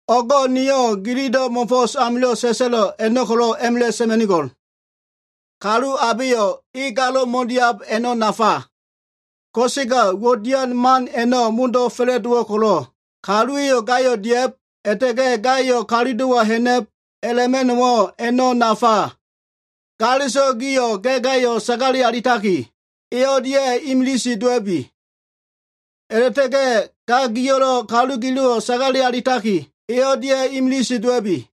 O꞉go꞉ niyo꞉ gililo꞉ mo꞉fo꞉s amilo꞉ sa꞉sa꞉lo꞉ a꞉no꞉ ko꞉lo꞉ a꞉ma꞉la꞉ sa꞉ma꞉nigo꞉l. Kalu abeyo꞉ e galo꞉ mo꞉diab, a꞉no꞉ nafa. Ko꞉sega uwo꞉ dian man a꞉no꞉ modo꞉ fa꞉la꞉dowo꞉ ko꞉lo꞉, kaluwa꞉yo꞉ gayo꞉ dia꞉b, a꞉la꞉ta꞉ga꞉ gayo꞉ kalulo꞉wa ha꞉na꞉b a꞉la꞉ma꞉no꞉wo꞉ a꞉no꞉ nafa. Galeso꞉ gio꞉ ga꞉ gayo꞉ sagale alitaki, e o꞉lia꞉ imilise dowa꞉bi. A꞉la꞉ta꞉ga꞉yo꞉ ga gio꞉lo꞉ kalu gilo꞉wo꞉ sagale alitaki, e o꞉lia꞉ imilise dowa꞉bi.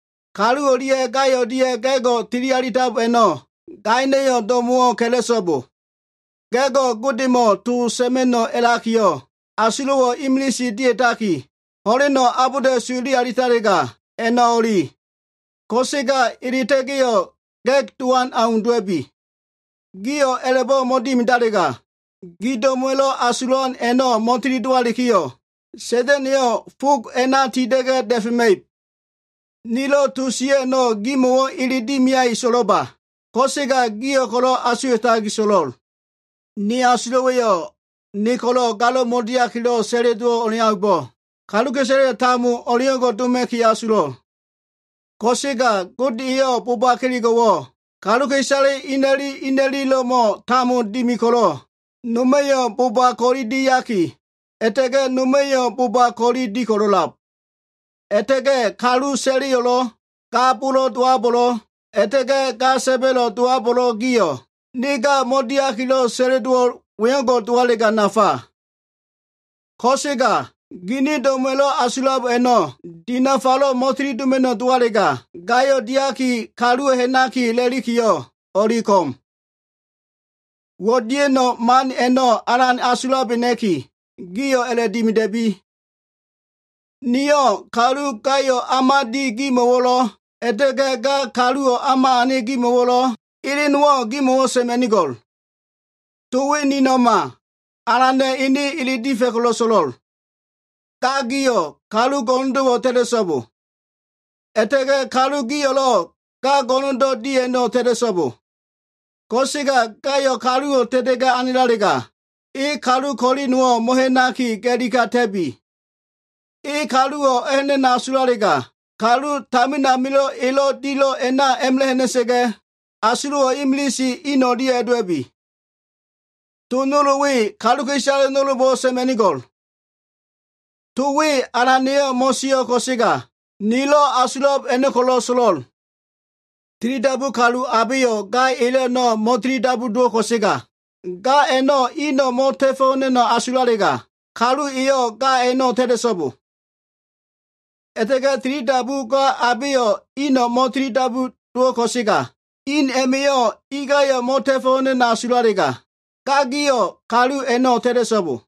Kalu o꞉lia꞉ ga o꞉lia꞉ ga꞉go꞉ tili alitab a꞉no꞉, gaino꞉ do꞉mo꞉wo꞉ ka꞉la꞉so꞉bo. Ga꞉go꞉ Godemo꞉ to sa꞉ma꞉no꞉ a꞉lakiyo꞉, asulo꞉wo꞉ imilise dia꞉taki, ho꞉leno꞉ abolda꞉su ele alitalega, a꞉no꞉ o꞉li. Ko꞉sega eleta꞉ga꞉yo꞉, ga꞉g dowan au dowa꞉bi. Gio꞉ a꞉la꞉bo꞉ mo꞉dimidalega, gi do꞉mo꞉wa꞉lo꞉ asulan a꞉no꞉ mo꞉tili dowalikiyo꞉, Sa꞉da꞉na꞉yo꞉ fog a꞉na tinda꞉ga꞉ da꞉fema꞉ib. Nilo꞉ to sio꞉ a꞉no꞉, gimo꞉ ele dimiaki so꞉lo꞉ba. Ko꞉sega gio꞉ ko꞉lo꞉ asuwa꞉taki so꞉lo꞉l. Ni asulo꞉wa꞉yo꞉ ne ko꞉lo꞉ galo꞉ mo꞉diakilo꞉ sa꞉le dowo꞉ o꞉leaumbo꞉, kaluka꞉isale tambo o꞉leo꞉ngo꞉ doma꞉ki asulo꞉l. Ko꞉sega Gode eyo꞉ boba kelego꞉wo꞉ kaluka꞉isale ina꞉li ina꞉lilo꞉mo꞉ tambo dimi ko꞉lo꞉, noma꞉yo꞉ boba ko꞉li diaki, a꞉la꞉ta꞉ga꞉ noma꞉yo꞉ boba ko꞉li di ko꞉lo꞉lab. A꞉la꞉ta꞉ga꞉ kalu sa꞉leyo꞉lo꞉, ga bolo꞉ dowabo꞉lo꞉, a꞉la꞉ta꞉ga꞉ ga sa꞉ba꞉lo꞉ dowabo꞉lo꞉ gio꞉, ne ga mo꞉diakilo꞉ sa꞉le dowo꞉l wengo꞉ dowalega nafa. Ko꞉sega gini do꞉mo꞉wa꞉lo꞉ asulab a꞉no꞉ dinafalo꞉ mo꞉tili doma꞉no꞉ dowalega, gayo꞉ diaki, kalu ha꞉naki a꞉lalikiyo꞉ o꞉li ko꞉m. Uwo꞉ dia꞉no꞉ man a꞉no꞉ alan asulabena꞉ki, gio꞉ a꞉la꞉dimida꞉bi. Niyo꞉ kalu gayo꞉ o꞉ma di gimo꞉wo꞉lo꞉, a꞉la꞉ta꞉ga꞉ ga kaluwo꞉ o꞉ma ane gimo꞉wo꞉lo꞉, ele nowo꞉ gimo꞉ sa꞉ma꞉nigo꞉l. To we nino꞉ma, Alana꞉ ene ele difa꞉ ko꞉lo꞉ so꞉lo꞉l. Ga gio꞉, kalu go꞉no꞉ndo꞉wo꞉ ta꞉ta꞉so꞉bo. A꞉la꞉ta꞉ga꞉ kalu gio꞉lo꞉ ga go꞉no꞉ndo꞉ di a꞉no꞉ ta꞉ta꞉so꞉bo. Ko꞉sega gayo꞉ kaluwo꞉ ta꞉ta꞉ga꞉ anelalega, e kalu ko꞉li nowo꞉ mo꞉ha꞉naki ga꞉li kata꞉bi. E kaluwo꞉ a꞉ha꞉na꞉no꞉ asulalega, kalu tamin amilo꞉ elo꞉ dilo꞉ a꞉na a꞉ma꞉la꞉ ha꞉na꞉sa꞉ga꞉, asulo꞉wo꞉ imilise in o꞉lia꞉ a꞉dowa꞉bi. To nol we kaluka꞉isale nolbo꞉wo꞉ sa꞉ma꞉nigo꞉l. To we Alana꞉yo꞉ mo꞉sio꞉ ko꞉sega, nilo꞉ asulab a꞉no꞉ ko꞉lo꞉ so꞉lo꞉l. Tilidabu kalu abeyo꞉ ga elo꞉ a꞉no꞉ mo꞉tilidabu dowo꞉ ko꞉sega, ga a꞉no꞉ ino꞉ mo꞉ta꞉fo꞉ ha꞉na꞉no꞉ asulalega, kalu eyo꞉ ga a꞉no꞉ ta꞉ta꞉so꞉bo. A꞉la꞉ta꞉ga꞉ tilidabu ga abeyo꞉ ino꞉ mo꞉tilidabu ko꞉sega, in a꞉ma꞉yo꞉ ingayo꞉ mo꞉ta꞉fo꞉ ha꞉na꞉no꞉ asulalega, ga giyo꞉ kalu a꞉no꞉ ta꞉ta꞉so꞉bo.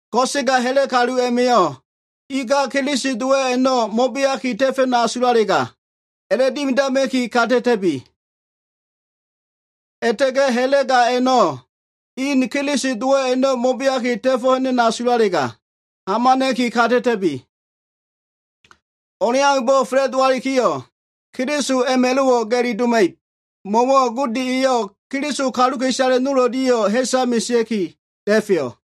Ko꞉sega ha꞉la꞉ kalu a꞉ma꞉yo꞉ inga Keliso dowo꞉ a꞉no꞉ mo꞉beaki ta꞉fa꞉no꞉ asulalega, a꞉la꞉dimidama꞉ki kata꞉ta꞉bi. A꞉la꞉ta꞉ga꞉ ha꞉la꞉ ga a꞉no꞉ in Keliso dowo꞉ a꞉no꞉ mo꞉beaki ta꞉fo꞉ ha꞉na꞉no꞉ asulalega, hamana꞉ki kata꞉ta꞉bi. O꞉leaumbo꞉ fa꞉la꞉dowalikiyo꞉, Keliso a꞉ma꞉lo꞉wo꞉ ga꞉li doma꞉ib. Mo꞉wo꞉ Gode eyo꞉ Keliso kaluka꞉isale nol o꞉lia꞉yo꞉ ha꞉sa mesea꞉ki da꞉feyo꞉.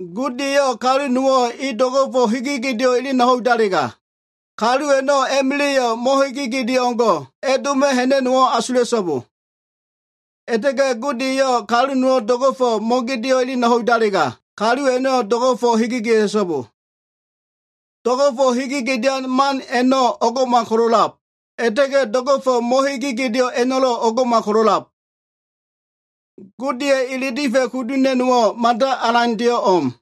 Gode eyo꞉ kalu nowo꞉ e do꞉go꞉fo꞉ hege gedeo꞉ elena ho꞉idalega, kalu a꞉no꞉ a꞉ma꞉la꞉yo꞉ mo꞉hege gedeo꞉ o꞉ngo꞉ a꞉doma꞉ ha꞉na꞉no꞉wo꞉ asula꞉so꞉bo. A꞉la꞉ta꞉ga꞉ Gode eyo꞉ kalu nowo꞉ do꞉go꞉fo꞉ mo꞉gedeo꞉ elena ho꞉idalega, kalu a꞉no꞉ do꞉go꞉fo꞉ hege gedea꞉so꞉bo. Do꞉go꞉fo꞉ hege gedean man a꞉no꞉ o꞉ngo꞉mal ko꞉lo꞉lab. A꞉la꞉ta꞉ga꞉ do꞉go꞉fo꞉ mo꞉hege gedeo꞉ a꞉no꞉lo꞉ o꞉ngo꞉mal ko꞉lo꞉lab. Godeya꞉ ele difa꞉ kudu ha꞉na꞉no꞉wo꞉ mada alandeyo꞉ o꞉m.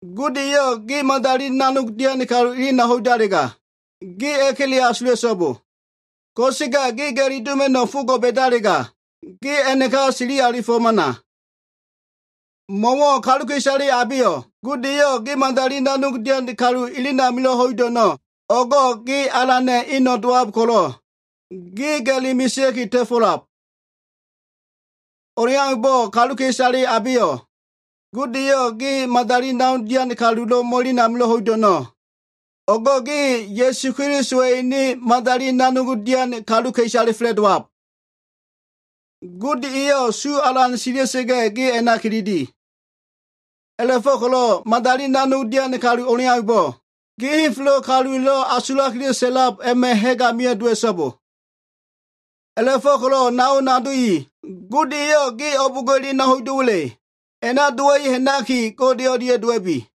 Gode eyo꞉ ge madali nanogdo꞉ dian kalu elena ho꞉idalega, ge a꞉kele asula꞉so꞉bo. Ko꞉sega ge ga꞉li doma꞉no꞉ fogo꞉ ba꞉dalega, ge a꞉naka sili alifo꞉ hamana. Mo꞉wo꞉ kaluka꞉isale abeyo꞉ Gode eyo꞉ ge madali nanogdo꞉ dian kalu elen amilo꞉ ho꞉ido꞉ a꞉no꞉, o꞉go꞉ ge Alana꞉ eno꞉ dowab ko꞉lo꞉, ge ga꞉li mesea꞉ki ta꞉fo꞉lab. O꞉leaumbo꞉ kaluka꞉isale abeyo꞉ Gode eyo꞉ ge madali nanog dian kalulo꞉ mo꞉elen amilo꞉ ho꞉ido꞉ a꞉no꞉, o꞉go꞉ ge Ya꞉su Kelisowa꞉ ene madali nanog dian kaluka꞉isale fa꞉la꞉dowab. Gode eyo꞉ su alan sila꞉sa꞉ga꞉, gio꞉ a꞉na kilili. A꞉la꞉fo꞉ko꞉lo꞉ madali nanog dian kalu o꞉leaumbo꞉, ge henfelo꞉ kaluwa꞉lo꞉ asulakilo꞉ sa꞉lab a꞉ma꞉ ha꞉g amio꞉ dowa꞉so꞉bo. A꞉la꞉fo꞉ko꞉lo꞉ nao nado i, Gode eyo꞉ ge o꞉bo꞉ngo꞉ elena ho꞉ido꞉wa꞉le, a꞉na dowa꞉i ha꞉naki, Gode o꞉lia꞉ dowa꞉bi.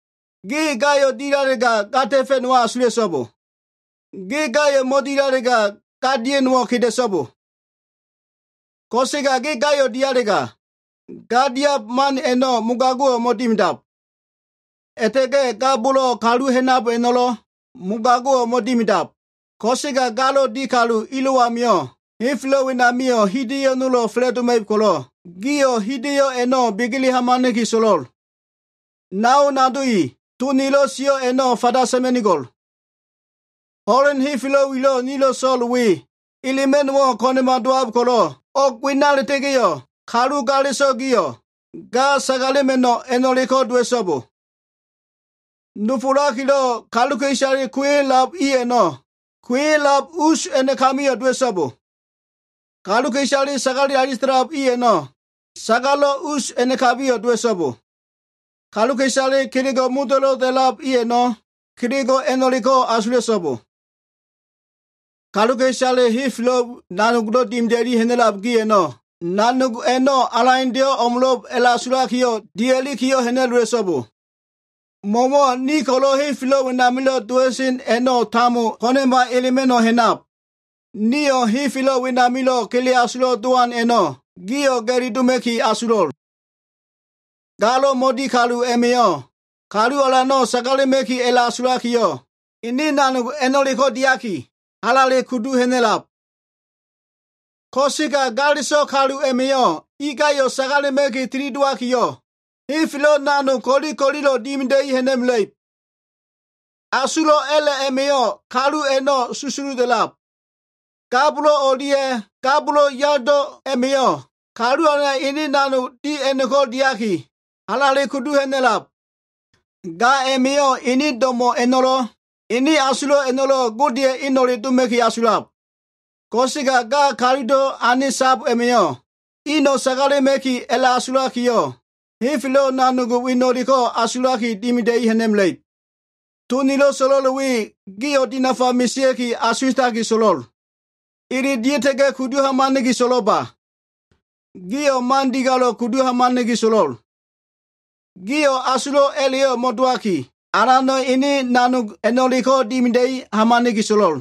Ge gayo꞉ dilalega, ga ta꞉fa꞉no꞉wo꞉ asula꞉so꞉bo. Ge gayo꞉ mo꞉dilalega, ga dia꞉no꞉wo꞉ keda꞉so꞉bo. Ko꞉sega ge gayo꞉ dialega, ga diab man a꞉no꞉ mogago꞉wo꞉ mo꞉dimidab. A꞉la꞉ta꞉ga꞉ ga bolo꞉ kalu ha꞉nab a꞉no꞉lo꞉, mogago꞉wo꞉ mo꞉dimidab. Ko꞉sega galo꞉ di kalu ilo꞉ amio꞉, henfelo꞉ wenamio꞉ hida꞉yo꞉ nolo꞉ fa꞉la꞉doma꞉ib ko꞉lo꞉, gio꞉ hida꞉yo꞉ a꞉no꞉ begele hamana꞉ki so꞉lo꞉l. Nao nado i, to nilo꞉ sio꞉ a꞉no꞉ fanda sa꞉ma꞉nigo꞉l. Ho꞉len nilo꞉ so꞉l we, elema꞉no꞉wo꞉ ko꞉na꞉ma dowab ko꞉lo꞉, o꞉g wena a꞉la꞉ta꞉ga꞉yo꞉ kalu galeso꞉ gio꞉, ga sagalema꞉no꞉ a꞉no꞉leko꞉ dowa꞉so꞉bo. Nofolakilo꞉ kaluka꞉isale kuo꞉ya꞉lab i a꞉no꞉, kuo꞉ya꞉lab us a꞉nakabiyo꞉ dowa꞉so꞉bo. Kaluka꞉isale sagale alita꞉lab i a꞉no꞉, sagalo꞉ us a꞉nakabiyo꞉ dowa꞉so꞉bo. Kaluka꞉isale kelego꞉ modo꞉lo꞉ dia꞉lab i a꞉no꞉, kelego꞉ a꞉no꞉leko꞉ asula꞉so꞉bo. Kaluka꞉isale henfelo꞉ nanogdo꞉ dimida꞉li ha꞉na꞉lab gi a꞉no꞉, nanog a꞉no꞉ alandeyo꞉ o꞉mo꞉lo꞉b a꞉la꞉asulakiyo꞉ dia꞉li ha꞉na꞉lowa꞉so꞉bo. Mo꞉wo꞉ ni ko꞉lo꞉ henfelo꞉ wenamilo꞉ dowa꞉sen a꞉no꞉ tambo ko꞉na꞉ma elema꞉no꞉ ha꞉nab. Niyo꞉ henfelo꞉ wenamilo꞉ kele asulo꞉ dowan a꞉no꞉ gio꞉ ga꞉li doma꞉ki asulo꞉l. Galo꞉ mo꞉di kalu a꞉ma꞉yo꞉ Kalu Alano꞉ sagalema꞉ki a꞉la꞉asulakiyo꞉, ene nanogde a꞉no꞉leko꞉ diaki, halale kudu ha꞉na꞉lab. Ko꞉sega galeso꞉ kalu a꞉ma꞉yo꞉ ingayo꞉ sagalema꞉ki tilidowakiyo꞉, henfelo꞉ nanog ko꞉li ko꞉lilo꞉ dimida꞉i ha꞉na꞉mela꞉ib. Asulo꞉ a꞉la꞉ a꞉ma꞉yo꞉, kalu a꞉no꞉ susuda꞉lab. Ga bolo꞉ o꞉lia꞉ ga bolo꞉yado a꞉ma꞉yo꞉, Kalu Alana꞉ ene nanogde a꞉no꞉leko꞉ diaki, halale kudu ha꞉na꞉lab. Ga a꞉ma꞉yo꞉ ene do꞉mo꞉ a꞉no꞉lo꞉, ene asulo꞉ a꞉no꞉lo꞉ Godeya꞉ eno꞉le doma꞉ki asulab. Ko꞉sega ga kalulo꞉ ane sab a꞉ma꞉yo꞉, ino꞉ sagalema꞉ki a꞉la꞉asulakiyo꞉, henfelo꞉ nanog weno꞉ ko꞉lo꞉ asulaki dimida꞉i ha꞉na꞉mela꞉ib. To nilo꞉ so꞉lo꞉l we gio꞉ dinafa mesea꞉ki asuwa꞉taki so꞉lo꞉l. Ele dia꞉ta kudu hamana꞉ki so꞉lo꞉ba. Gio꞉ man digalo꞉ kudu hamana꞉ki so꞉lo꞉l. Gio꞉ asulo꞉ a꞉la꞉yo꞉ mo꞉dowaki, Alana꞉ ene nanog a꞉no꞉leko꞉ dimida꞉i hamana꞉ki so꞉lo꞉l.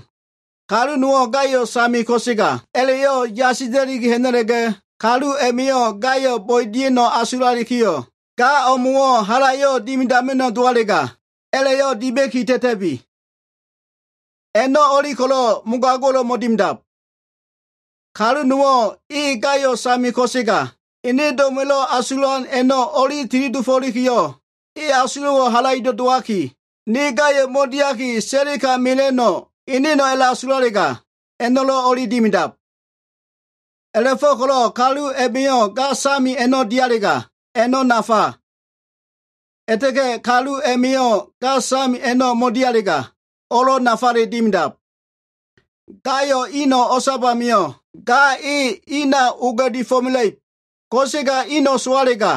Kalu nowo꞉ gayo꞉ same ko꞉sega, a꞉la꞉yo꞉ yasila꞉li ha꞉na꞉la꞉ga, kalu a꞉ma꞉yo꞉ gayo꞉ bo꞉e dia꞉no꞉ asulalikiyo꞉, ga o꞉mo꞉wo꞉ halayo꞉ dimidama꞉no꞉ dowalega, a꞉la꞉yo꞉ dima꞉ki ta꞉ta꞉bi. A꞉no꞉ o꞉li ko꞉lo꞉ mogago꞉lo꞉ mo꞉dimidab. Kalu nowo꞉ e gayo꞉ same ko꞉sega, ene do꞉mo꞉wa꞉lo꞉ asulan a꞉no꞉ o꞉li tili dofo꞉likiyo꞉, e asulo꞉wo꞉ halaido꞉ dowaki, ne gayo꞉ mo꞉diaki, sa꞉le ka mela꞉no꞉ eneno꞉ a꞉la꞉asulalega, a꞉no꞉lo꞉ o꞉li dimidab. A꞉la꞉fo꞉ko꞉lo꞉ kalu a꞉ma꞉yo꞉ ga same a꞉no꞉ dialega, a꞉no꞉ nafa. A꞉la꞉ta꞉ga꞉ kalu a꞉ma꞉yo꞉ ga same a꞉no꞉ mo꞉dialega, o꞉lo꞉ nafale dimidab. Gayo꞉ ino꞉ o꞉sab amio꞉, ga e ina oga꞉difo꞉ mela꞉ib. Ko꞉sega ino꞉ sowalega,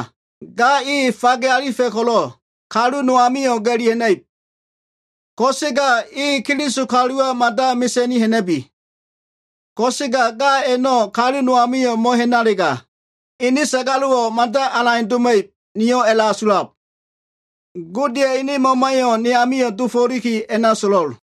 ga e fage alifa꞉ ko꞉lo꞉, kalu no amio꞉ ga꞉li ha꞉na꞉ib. Ko꞉sega e Keliso kaluwa mada mesa꞉ni ha꞉na꞉bi. Ko꞉sega ga a꞉no꞉ kalu no amio꞉ mo꞉ha꞉nalega, ene sagalo꞉wo꞉ mada alande doma꞉ib, niyo꞉ a꞉la꞉asulab. Godeya꞉ ene Mamayo꞉ ne amio꞉ dofo꞉liki a꞉na so꞉lo꞉l.